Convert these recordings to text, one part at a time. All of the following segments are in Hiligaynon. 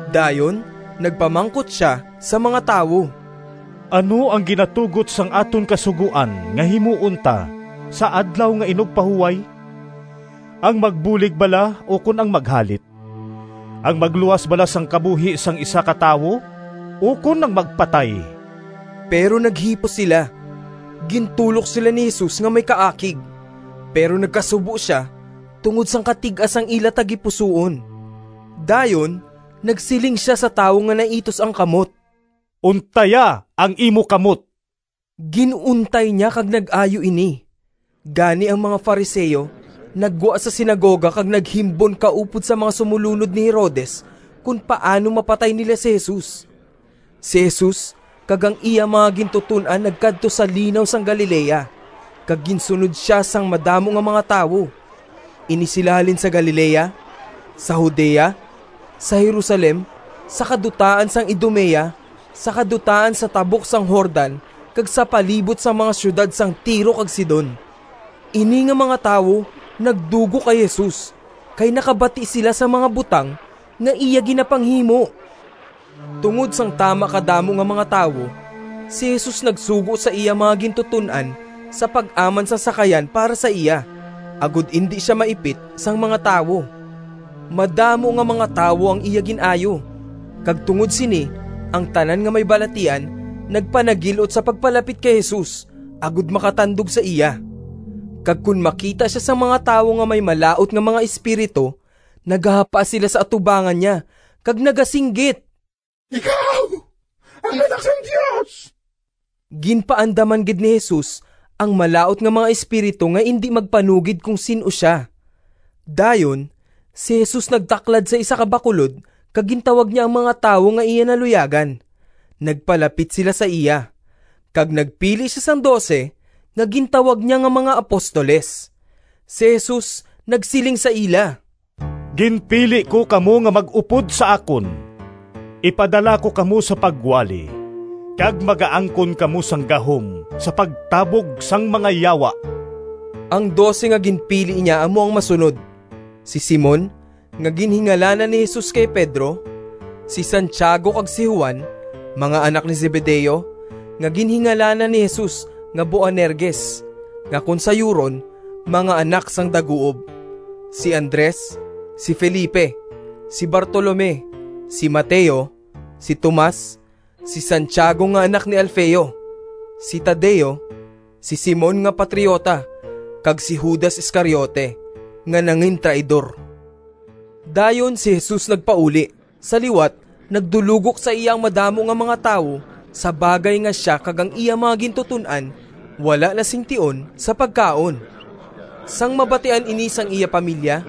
Dayon nagpamangkot sia sa mga tawo: “Ano ang ginatugot sang aton Kasugoan nga himuon ta sa Adlaw nga Inugpahuway? Ang magbulig bala ukon ang maghalit? Ang magluwas bala sang kabuhi sang isa ka tawo ukon ang magpatay?” Pero naghipos sila. Gintulok sila ni Jesus nga may kaakig, pero nagkasubo sia tungod sang katig-a sang ila tagipusoon. Dayon nagsiling sia sa tawo nga naitus ang kamot, “Untaya ang imo kamot.” Gin-untay niya kag nag-ayo ini. Gani ang mga Fariseo naggwa sa sinagoga kag naghimbon kaupod sa mga sumolunod ni Herodes kon paano mapatay nila si Jesus. Si Jesus kag ang iya mga gintuton-an nagkadto sa Linaw sang Galilea, kag ginsunod sia sang madamo nga mga tawo. Ini sila halin sa Galilea, sa Judea, sa Jerusalem, sa kadutaan sang Idumea, sa kadutaan sa tabok sang Jordan kag sa palibot sang mga siyudad sang Tiro kag Sidon. Ini nga mga tawo nagdugok kay Jesus, kay nakabati sila sang mga butang nga iya ginapanghimo. Tungod sang tama kadamo nga mga tawo, si Jesus nagsugo sa iya mga gintuton-an sa pag-aman sang sakayan para sa iya, agod indi sia maipit sang mga tawo. Madamo nga mga tawo ang iya gin-ayo, kag tungod sini ang tanan nga may balatian nagpanagil-ot sa pagpalapit kay Jesus, agod makatandog sa iya. Kag kon makita sia sang mga tawo nga may malaut nga mga espiritu, nagahapa sila sa atubangan niya kag nagasinggit, “Ikaw ang Anak sang Dios!” Ginpaandaman gid ni Jesus ang malaut nga mga espiritu nga indi magpanugid kon sin-o sia. Dayon si Jesus nagtaklad sa isa ka bakulod kag gintawag niya ang mga tawo nga iya naluyagan. Nagpalapit sila sa iya, kag nagpili sia sang dose nga gintawag niya nga mga apostoles. Si Jesus nagsiling sa ila, “Ginpili ko kamo nga mag-upod sa akon. Ipadala ko kamo sa pagwali, kag magaangkon kamo sang gahom sa pagtabog sang mga yawa.” Ang dose nga ginpili niya amo ang masunod: si Simon (nga ginhingalanan ni Jesus kay Pedro); si Santiago kag si Juan, mga anak ni Zebedeo (nga ginhingalanan ni Jesus nga Boanerges, nga kon sayuron “Mga Anak sang Daguob”); si Andres, si Felipe, si Bartolome, si Mateo, si Tomas, si Santiago nga anak ni Alfeo, si Tadeo, si Simon nga patriota, kag si Judas Iscariote nga nangintraidor. Dayon si Jesus nagpauli. Sa liwat nagdulogok sa iya ang madamo nga mga tawo sa bagay nga sia kag ang iya mga gintuton-an wala na sing tion sa pagkaon. Sang mabatian ini sang iya pamilya,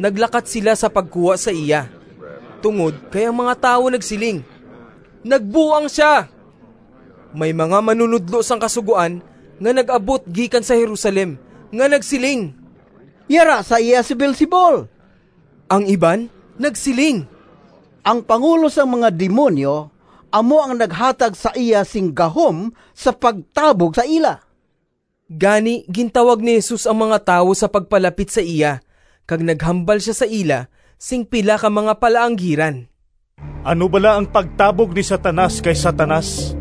naglakat sila sa pagkuha sa iya, tungod kay ang mga tawo nagsiling, “Nagbuang sia!” May mga manunodlo sang Kasugoan nga nag-abot gikan sa Jerusalem nga nagsiling, “Yara sa iya si Beelzebul!” Ang iban nagsiling, “Ang pangulo sang mga demonyo amo ang naghatag sa iya sing gahom sa pagtabog sa ila.” Gani gintawag ni Jesus ang mga tawo sa pagpalapit sa iya kag naghambal sia sa ila sing pila ka mga palaanggiran, “Ano bala ang pagtabog ni Satanas kay Satanas?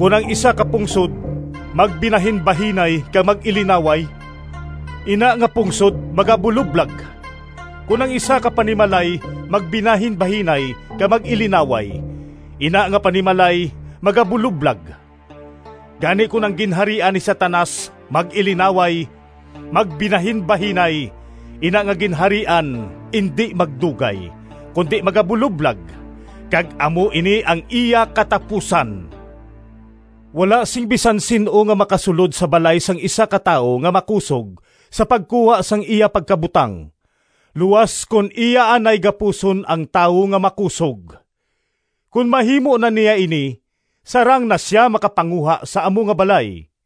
Kon ang isa ka pungsod magbinahinbahinay kag mag-ilinaway, ina nga pungsod magabuloblag. Kon ang isa ka panimalay magbinahinbahinay kag mag-ilinaway, ina nga panimalay magabuloblag. Gani, kon ang ginharian ni Satanas mag-ilinaway, magbinahinbahinay, ina nga ginharian indi magdugay, kundi magabuloblag, kag amo ini ang iya katapusan. “Wala sing bisan sin-o nga makasulod sa balay sang isa ka tawo nga makusog sa pagkuha sang iya pagkabutang, luas kon iya anay gapuson ang tawo nga makusog. Kon mahimo na niya ini sarang na sia makapanguha sa amo nga balay.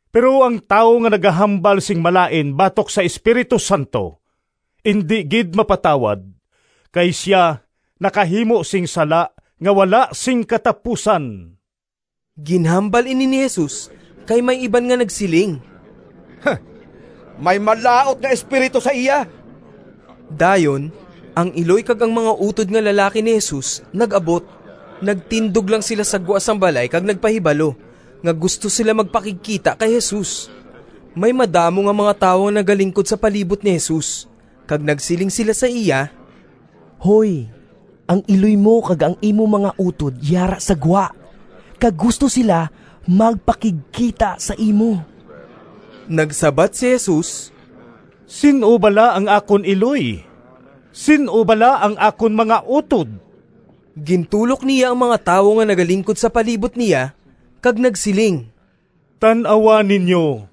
pero ang tawo nga nagahambal sing malain batok sa Espiritu Santo, indi gid mapatawad, kay sia nakahimo sing sala nga wala sing katapusan.” (Ginhambal ini ni Jesus, kay may iban nga nagsiling, “May malaut nga espiritu sa iya.”) Dayon ang iloy kag ang mga utod nga lalaki ni Jesus nag-abot. Nagtindog lang sila sa gwa sang balay kag nagpahibalo nga gusto sila magpakigkita kay Jesus. May madamo nga mga tawo nga nagalingkod sa palibot ni Jesus, kag nagsiling sila sa iya, “Hoy, ang iloy mo kag ang imo mga utod yara sa gwa, kag gusto sila magpakigkita sa imo.” Nagsabat si Jesus, “Sin-o bala ang akon iloy? Sin-o bala ang akon mga utod?” Gintulok niya ang mga tawo nga nagalingkod sa palibot niya, kag nagsiling, “Tan-awa ninyo,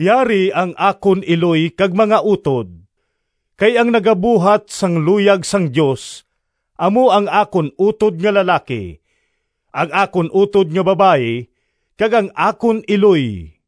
yari ang akon iloy kag mga utod! Kay ang nagabuhat sang luyag sang Dios, amo ang akon utod nga lalaki, ang akon utod nga babayi, kag ang akon iloy.”